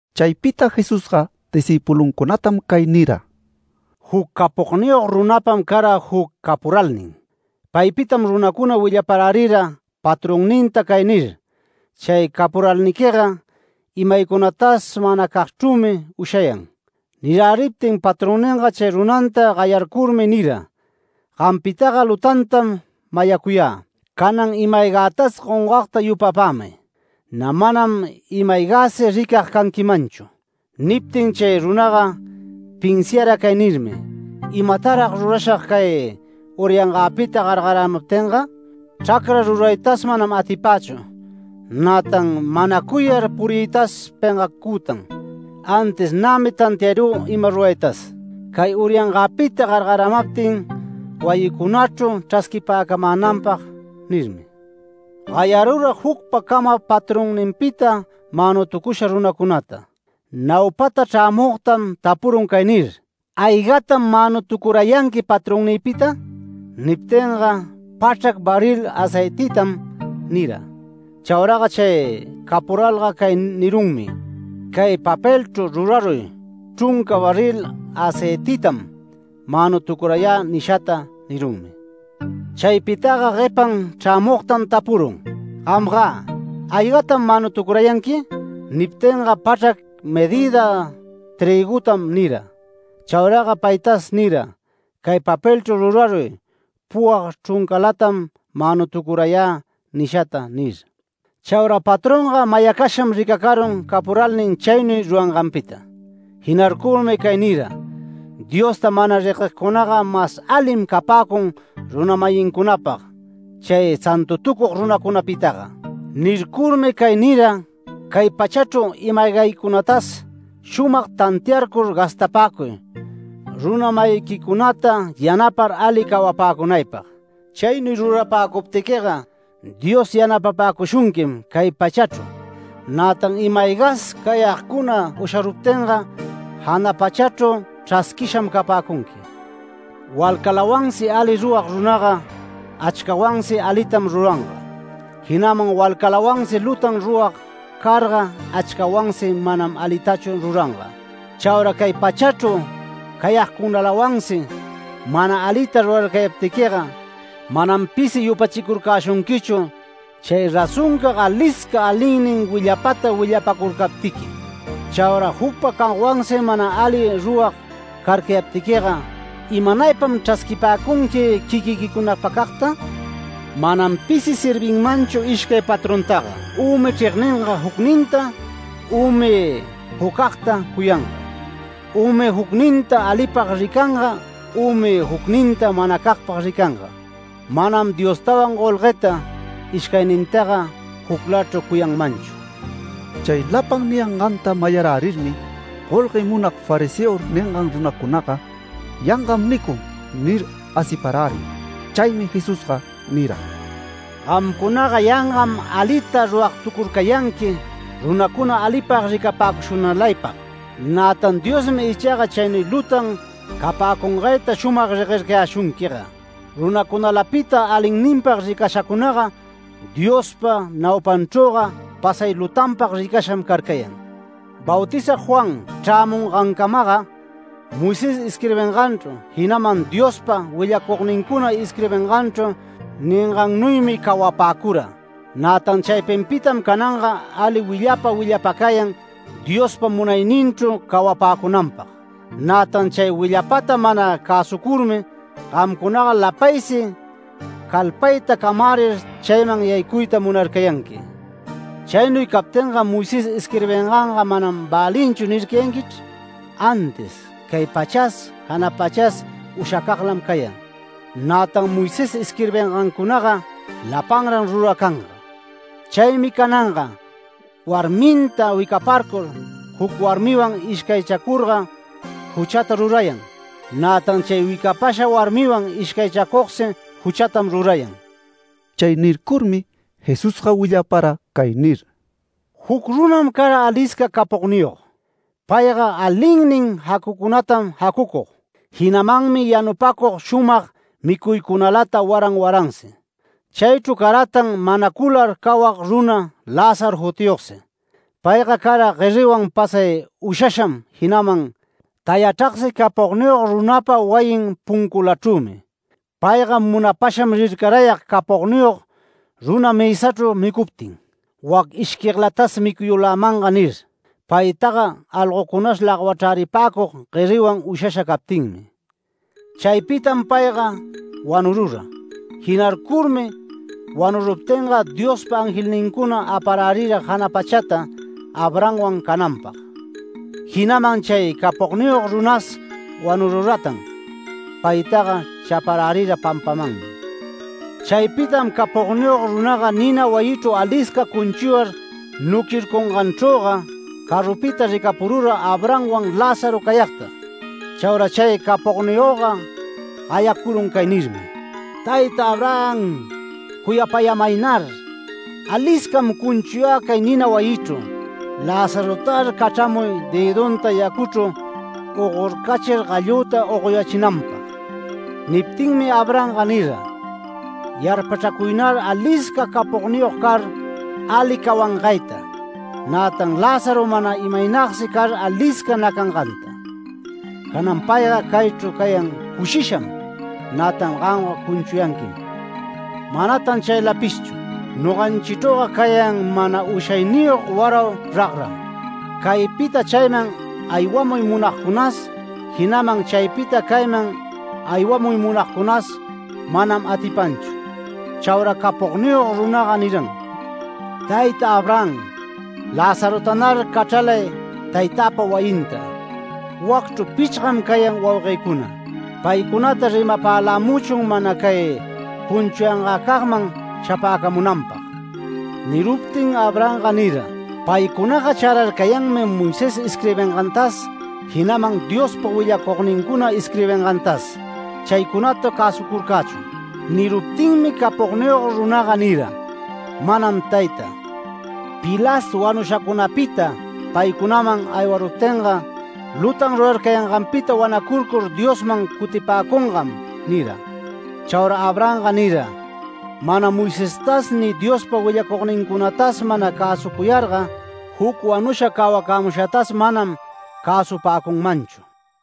Chaypita Jesusga discïpuluncunatam cay nira: “Juc capogniyog runapam cara juc capuralnin. Paypitam runacuna willaparärira patronninta cay nir: ‘Chay capuralninga imaycunatas manacagchrümi ushayan’. Niräriptin patronninga chay runanta gayarcurmi nira: ‘Gampitaga lutantam mayacuyä. Canan ima-aygätas gongagta yupapämay. Nä manam imä-aygäsi ricag canquimanchu’. Niptin chay runaga pinsiara cay nirmi: ‘¿Imatarag rurashag cay urayangäpita gargaramaptinga? Chracra ruraytas manam atipächu, nätan manacuyar puriytas pengacütan. Antis nämi tantiarü ima ruraytas, cay uryanganpita gargaramaptin wayincunachru chrasquipäcamänanpag’ nirmi. Gayarura jucpacama patronninpita manutucusha runacunata. Naupata chrämugtam tapurun cay nir: ‘¿Aygatam manutucurayanqui patronnïpita?’ Niptinga ‘Pachrac barril aceititam’ nira. Chauraga chay capuralga cay nirunmi: ‘Cay papelchru ruraruy chrunca barril aceititam manutucurayä nishata’ nirunmi. Chaypitaga guepan chrämugtam tapurun: ‘Gamgä, ¿aygatam manutucurayanqui?’ Niptinga ‘Pachrac medïda trïgutam’ nira. Chauraga paytas nira: ‘Cay papelchru ruraruy, puwag chruncalam manutucurayä nishata’ nir. Chaura patronga mayacasham ricacarun capuralnin chaynuy ruranganpita. Jinarcurmi cay nira: ‘Diosta mana reguegcunaga mas alim capäcun runa-mayincunapag chay santutucug runacunapitaga’. Nircurmi cay nira cay pachachru ima-aygaycunatas shumag tantiarcur gastapäcuy runa-mayiquicunata yanapar ali cawapäcunaypag. Chaynuy rurapäcuptiquiga Dios yanapapäcushunquim cay pachachru. Nätan imas aygas cayagcuna usharuptinga jana pachachru chrasquisham capäcunqui. Walcalawansi ali rurag runaga, achcawansi alitam ruranga. Jinaman walcawansi lutan rurag carga achcawansi manam alitachu ruranga. Chaura cay pachachru cayagcunalawansi mana alita rurarcayaptiquiga manam pisi yupachicurcäshunquichu chay razoncag alisca alinnin willapata willapacurcaptiqui. Chaura jucpacagwansi mana ali rurag carcayaptiquiga ¿imanaypam chrasquipäcunqui quiquiquicunapacagta? Manam pisi servinmanchu ishcay patrontaga ümi chregninga jucninta, ümi jucagta cuyanga. Ümi jucninta alipag ricacanga ümi jucninta manacagpag ricanga. Manam Diostawan golgueta ishcaynintaga juclachru cuyanmanchu”. Chay lapan niyanganta mayarärirmi golguela munag fariseo ningan runacunaga: “Yangam nicun” nir, asiparärin. Chaymi Jesusga nira: “Gamcunaga yangam alita ruragtucurcayanqui runacuna alipag ricapäcushunalaypag. Nätan Diosmi ichaga chaynuy lutan capäcungayta shumag reguercayäshunquiga. Runacunalapita alinninpag ricashacunaga Diospa naupanchrüga pasay lutanpag ricasham carcayan. Bautizag Juan chrämungancamaga Moisés isquirbinganchru, jinaman Diospa willacugnincuna isquirbinganchru ningannuymi cawapäcura. Nätan chaypinpitam cananga ali willapa willapacayan Diospa munayninchru cawapäcunanpag. Nätan chay willapata mana cäsucurmi, gamcunaga lapaysi calpayta camärir chayman yaycuyta munarcayanqui. Chaynuy captinga Moisés isquirbinganga ‘Manam välinchu’ nircayanquichr. Antis cay pachas, jana pachas ushacaglam cayan, nätan Moisés isquirbingancunaga lapanran ruracanga. Chaymi cananga warminta wicaparcur, juc warmiwan ishcaychacurga, juchata rurayan, nätan chay wicapasha warmiwan ishcaychacugsi juchata rurayan”. Chay nircurmi Jesusga willapara cay nir: “Juc runam cara alisca capogniyog. Payga alinnin jacucunalatam jacucug, jinamanmi yanupacug shumag micuycunalata waran waransi. Chaychru caratan manacular cawag runa Lázaro jutiyogsi. Payga cara gueriwan pasay ushasham jinaman tayachragsi capogniyog runapa wayin punculachrümi. Payga munapasham rircarayag capogniyog runa mësachru micuptin, ‘Wac ishquiglatas micuyulämanga’ nir. Paytaga algocunas lagwachräripacug gueriwan ushasha captinmi. Chaypitam payga wanurura. Jinarcurmi wanuruptinga, Diospa angelnincuna aparärira jana pachata Abrahamwan cananpag. Jinaman chay capogniyog runas wanururatan. Paytaga chaparärira pampamanmi. Chaypitam capogniyog runaga nina wayichru alisca cunchuyar nuquircunganchrüga, carupita ricapurura Abrahamwan Lázaro cayagta. Chaura chay capogniyogga gayacurun cay nirmi: ‘¡Tayta Abraham, cuyapämaynar! Aliscam cunchuyä cay nina wayichru. Lazarotar cachramuy dëdunta yacuchru ogorcachir gallüta ogoyächinanpag’. Niptinmi Abrahamga nira: ‘Yarpachracuynar alisca capogniyog car, ali cawangayta, nätan Lázaro mana imaynagsi car alisca nacanganta. Canan payga caychru cayan cushisham. Nätan gamga cunchuyanquim. Manatan chaylapishchu. Noganchichrüga cayan mana ushayniyog warau ragram. Caypita chayman aywamuy munagcunas, jinaman chaypita cayman aywamuy munagcunas manam atipanchu’. Chaura capogniyog runaga niram: ‘Tayta Abraham, Lazarotanar cachralay taytäpa wayinta. Wacchru pichgam cayan wauguëcuna. Paycunata rimapälämuchun mana cay cunchuyangäcagman shapäcamunanpag’. Niruptin Abrahamga nira: ‘Paycunaga chararcayanmi Moisés isquirbingantas, jinaman Diospa willacugnincuna isquirbingantas. Chaycunata cäsucurcächun’. Niruptinmi capogniyog runaga nira: ‘Manam tayta. Pilas wanushacunapita paycunaman aywaruptinga, lutan rurarcayanganpita wanacurcur Diosman cutipäcungam’ nira. Chaura Abrahamga nira: ‘Mana Moisestas ni Diospa willacugnincunatas mana cäsucuyarga, juc wanusha cawacämushatas manam cäsupäcunmanchu’”.